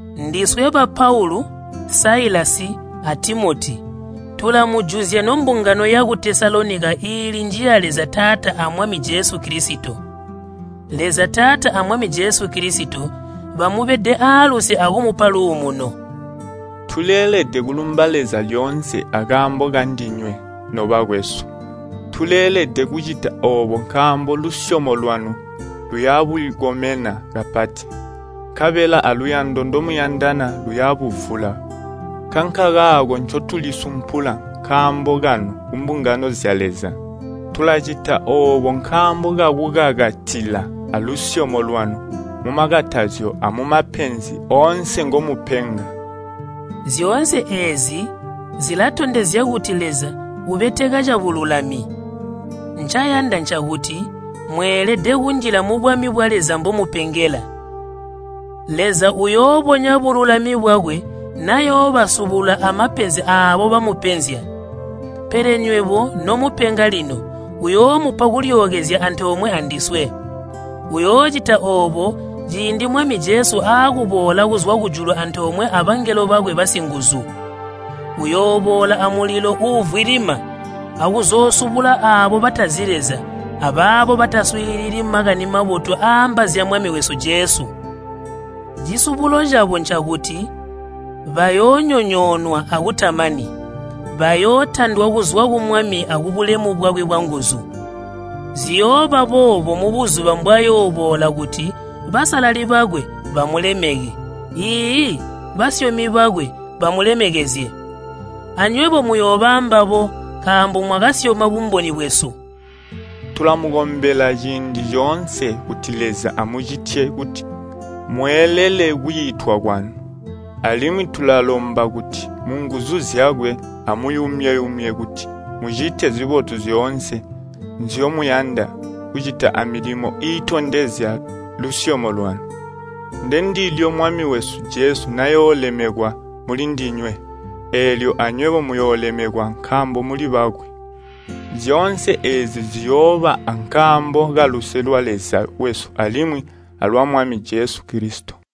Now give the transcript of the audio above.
Ndiswe ba Paulu, Siluvano, a Timoti, tulamujuzya nombungano yaku Tesalonika iili njiya Leza Taata a Mwami Jesu Kilisito. Leza Taata a Mwami Jesu Kilisito, bamubede aaluse akumupa luumuno. Tuleelede kulumba Leza lyoonse akaambo kandinywe, nobakwesu. Tuleelede kucita oobo nkaambo lusyomo lwanu luyabukomena kapati, nkabela aluyando ndomuyandana luyabuvula. Nkankakaako ncotulisumpula nkaambo kanu kumbungano zya Leza. Tulacita oobo nkaambo kakukakatila alusyomo lwanu mumakatazyo amumapenzi oonse ngomupenga. Zyoonse eezi zilatondezya kuti Leza ubeteka cabululami. Ncayanda ncakuti mweelede kunjila mubwami bwa Leza mbomupengela. Leza uyoobonya bululami bwakwe nayoobasubula amapenzi aabo bamupenzya. Pele nywebo nomupenga lino uyoomupa kulyookezya antoomwe andiswe. Uyoocita oobo ciindi Mwami Jesu aakuboola kuzwa kujulu antoomwe abangelo bakwe basinguzu. Uyooboola amulilo uuvwilima akuzoosubula aabo batazi Leza abaabo bataswiilili Makani Mabotu aaamba zya Mwami wesu Jesu. Cisubulo cabo ncakuti bayoonyonyoonwa akutamani. Bayootandwa kuzwa ku Mwami akubulemu bwakwe bwanguzu. Ziyooba boobo buzuba mbwayooboola kuti basalali bakwe bamulemeke, iiyi, basyomi bakwe bamulemekezye. Anywebo muyooba ambabo nkaambo mwakasyoma bumboni bwesu. Tulamukombela ciindi coonse kuti Leza amucitye kuti mweelele kwiitwa kwanu. Alimwi tulalomba kuti munguzu zyakwe amuyumye-yumye kuti mucite zibotu zyoonse nzyomuyanda kucita amilimo iitondezya lusyomo lwanu. Ndendilyo Mwami wesu Jesu nayoolemekwa mulindinywe, eelyo anywebo muyoolemekwa nkaambo muli bakwe. Zyoonse eezi ziyooba ankaambo kaluse lwa Leza wesu alimwi alwa Mwami Jesu Kilisito.